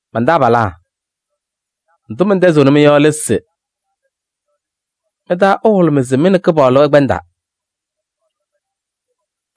Man-taabalaa! Ndʋ mɛntɛzɩɣnɩ-mɩ yɔ lɛ se mɩ-taa ɛhʋlʋmɩ se mɩ nɛ Kɩpaɣlʋ ɩkpɛndaa.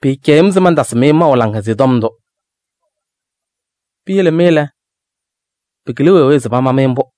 Pɩɩcɛyɩɣ-m se mantasɩ-mɩ maʋ Laŋhʋlʋmɩyɛ Tɔm ndʋ. Piyele mɩ lɛ, pɩkɩlɩ wee wee se pama-mɩ mbʋ.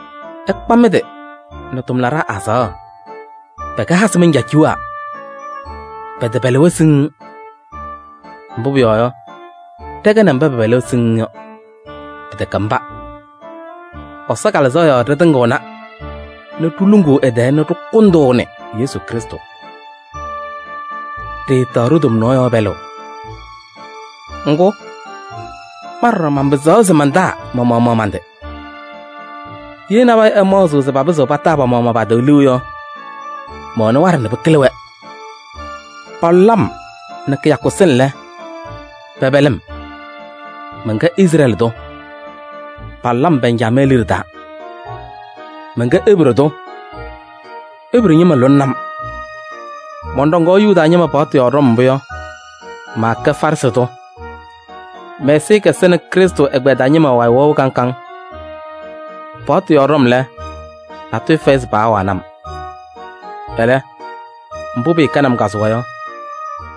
Ɩkpa mɩ-tɩ nɛ tʋmlaɖaa azaɣa, pɛkɛ hasɩ mancaaciwaa, pɛtɛpɛlɩ-wɛ siŋŋ. Mbʋ pʋyɔɔ yɔ, ɖɛkɛnɩ mba pɛpɛlɩ-wɛ siŋŋ yɔ, pɩtɛkɛ mba. Ɛsɔ Kalɩzaɣ yɔɔ ɖɩtɩŋɩɣna nɛ ɖiluŋuu ɛ-tɛɛ nɛ ɖɩkʋndʋʋnɩ Yesu Krɩstʋ. Ɖɩɩtaɣ tomnaɣ yɔɔ pɛlʋʋ. Ŋgʋ, ma ɖɔɖɔ manpɩzaɣ se mantaa ma-maɣmaɣ man-tɩ. Ye nabɛyɛ ɛmaɣzɩɣ se papɩzɩɣ pataa pa-maɣmaɣ pa-tɩ liu yɔ, mɛwɛnɩ waɖɛ nɛ pɩkɩlɩ-wɛ. Palʋlɩ-m nɛ kɩyakʋ sɩŋ lɛ, pɛpɛlɩ-m. Mɛnkɛ Izrɛɛlɩ tʋ, palʋlɩ-m Bɛnjamɛɛ liɖe taa. Mɛnkɛ Ebree tʋ, Ebree ñɩma lʋlɩnɩ-m. Mɔnɖɔŋaɣ Yuda ñɩma paɣtʋ yɔɔ ɖɔm mbʋ yɔ, maakɛ Farɩsɩ tʋ. Mɛ-ɛzɩyɛ kɛsɛnɩ Krɩstʋ ɛgbɛyɛ taa ñɩma wayɩ wɛʋ kaŋ kaŋ. Paɣtʋ yɔɔ ɖɔm lɛ, natʋyʋ fɛyɩ se paawanɩ-m. Ɛlɛ, mbʋ pɩɩkɛnɩ-m kazʋwa yɔ,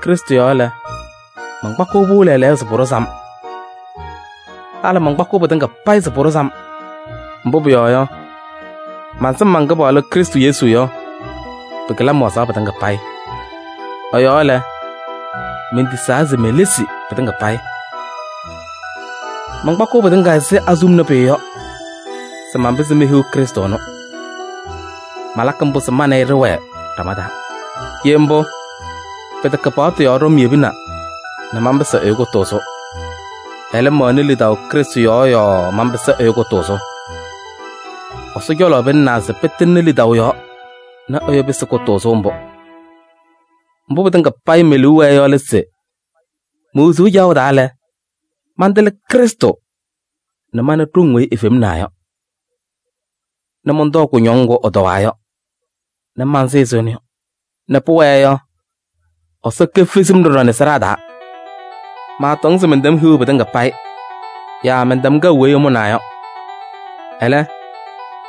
Krɩstʋ yɔɔ lɛ, mankpakɩɣ-pʋ lɛɛlɛɛyɔ se pʋɖʋzɩ-m. Halɩ mankpakɩɣ pɩtɩŋa payɩ se pʋɖʋzɩ-m, mbʋ pʋyɔɔ yɔ, mansɩm man-Kɩpaɣlʋ Krɩstʋ Yesu yɔ, pɩkɩlɩ-m wazaɣ pɩtɩŋa payɩ. Ɛ-yɔɔ lɛ, mentisaa se melesi pɩtɩŋa payɩ. Mankpakɩɣ pɩtɩŋa ɛzɩ azuluma pʋyʋ yɔ se manpɩzɩ mehiɣ Krɩstʋ ɛnʋ. Malakɩ mbʋ se ma nɛ ɩ ɖɩwɛɛ ɖama taa. Ye mbʋ, pɩtɛkɛ paɣtʋ yɔɔ ɖɔm yebina nɛ manpɩsɩ ɛyʋ kʋtʋʋzʋ. Ɛlɛ, mɛwɛnɩ lidaʋ Krɩstʋ yɔɔ yɔɔ manpɩsɩ ɛyʋ kʋtʋʋzʋ. Ɛsɔ cɔlɔ pɩlɩnaa se pɩtɩŋnɩ lidaʋ yɔɔ nɛ ɛyʋ pɩsɩ kʋtʋʋzʋ mbʋ. Mbʋ pɩtɩŋa me-liu wɛɛ yɔ lɛ se: me-wezuu caɣʋ taa lɛ, mantɩlɩ Krɩstʋ nɛ mana ɖoŋ weyi efemnaa yɔ, nɛ mɔntɔɔ kʋñɔŋ ŋgʋ ɛtɔwaa yɔ nɛ mansɩ ɛzɩ ɛnʋ yɔ, nɛ pʋwɛɛ yɔ, Ɛsɔ kefezi-m ɖɔɖɔ sɩɖaa taa. Maatɔŋ se mɛntɛm hiɣu pɩtɩŋa payɩ yaa mɛntɛm kɛʋ weyi ɛmʋnaa yɔ. Ɛlɛ,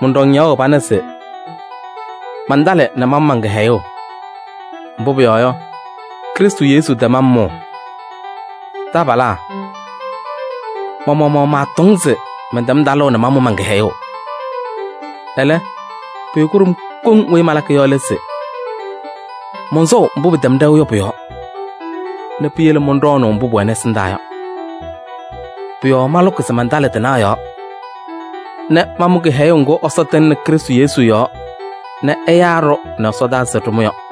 mɔnɖɔŋ ñaɣʋ pana se mantalɩ nɛ mamʋ man-kɩhɛyʋʋ. Mbʋ pʋyɔɔ yɔ, Krɩstʋ Yesu tɛm-m mʋʋ. Taabalaa! Ma-maɣmaɣ maatɔŋ se mɛntɛm talʋʋ nɛ mamʋ man-kɩhɛyʋʋ. Ɛlɛ, pʋyʋ kʋɖʋm koŋ weyi malakɩ yɔ lɛ se: mɔnsɔʋ mbʋ pɩtɛm ɖɛʋ yɔ pʋ-yɔɔ nɛ piyele mɔnɖɔɔnɩ mbʋ pʋwɛnɩ ɛsɩndaa yɔ. Pʋ-yɔɔ malʋkɩ se mantalɩ tɩnaɣ yɔɔ nɛ mamʋ kɩhɛyʋʋ ŋgʋ Ɛsɔ tɩŋnɩ Krɩstʋ Yesu yɔɔ nɛ ɛyaa-ɖʋ nɛ ɛsɔdaa se ɖɩmʋ yɔ.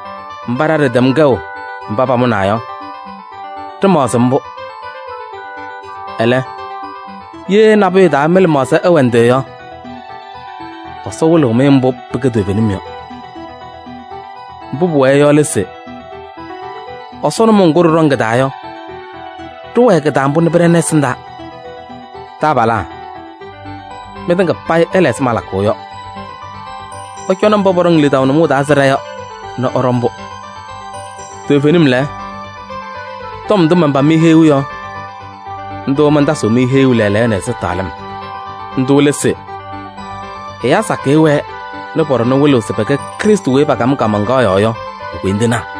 Mba ɖa ɖɩtɛm kɛʋ mba pamʋnaa yɔ, ɖɩmaɣzɩ mbʋ. Ɛlɛ, ye nabʋyʋ taa mɩ-lɩmaɣza ɛwɛ ndɩ yɔ, Ɛsɔ wɩlɩɣ-mɩ mbʋ pɩkɛ toovenim yɔ. Mbʋ pʋwɛɛ yɔ lɛ se: Ɛsɔ nʋmɔʋ ŋgʋ ɖɩɖɔŋ kɩ-taa yɔ, ɖɩwɛɛ kɩ-taa mbʋ nɛ pɩɖɛnɩ ɛsɩndaa. Taabalaa! Mɩtɩŋa payɩ ɩla ɛzɩ malakʋʋ yɔ. Ɩcɔnɩ mba pɔɖɔŋ lidaʋ nʋmɔʋ taa ɛzɩ ɖa yɔ nɛ ɩɖɔ mbʋ. Toovenim lɛ, tɔm ndʋ manpam-mɩ heyuu yɔ, ndʋ mantasɩɣ-mɩ heyuu lɛɛlɛɛyɔ nɛ ɛzɩtɛɣlɩm. Ndʋ lɛ se: ɛyaa sakɩyɛ wɛɛ nɛ pɔ-ɖɔnɛ wɩlɩɣ se pɛkɛ Krɩstʋ weyi pakam-ɩ kaamaŋkaɣ yɔɔ yɔ e-koyindinaa.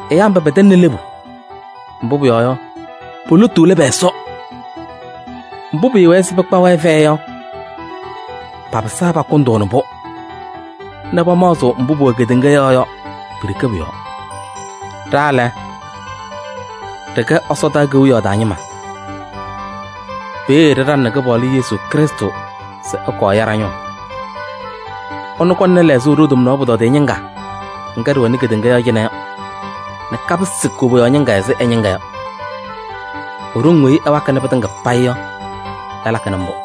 Ɛyaa mba pɛtɛŋnɩ lebu, mbʋ pʋyɔɔ yɔ, po-lotu lɛ pɛ-Ɛsɔ. Mbʋ pɩɩwɛɛ se pɩkpa-wɛ fɛyɛ yɔ, papɩsaa pakʋndʋʋnɩ-pʋ nɛ pamaɣzɩɣ mbʋ pʋwɛ kedeŋa yɔɔ yɔ, pʋ-yɔɔ ɖeke. Ɖa lɛ, ɖɩkɛ ɛsɔdaa kewiyaɣ taa ñɩma. Peeye ɖɩɖaŋnɩ Kɩpaɣlʋ Yesu Krɩstʋ se ɛkɔɔ ɛya ɖa-ñʋʋ. Ɛnʋ kɔŋnɩ lɛɣzʋʋ ɖo-tomnaɣ pʋtɔdɩyɛ ñɩŋga ŋga ɖɩwɛnɩ kedeŋa yɔɔ cɩnɛ yɔ nɛ kapɩsɩ koboyaɣ ñɩŋga ɛzɩ ɛ-ñɩŋga yɔ. E-ɖoŋ weyi ɛwakɩnɩ pɩtɩŋa payɩ yɔ ɛlakɩnɩ mbʋ.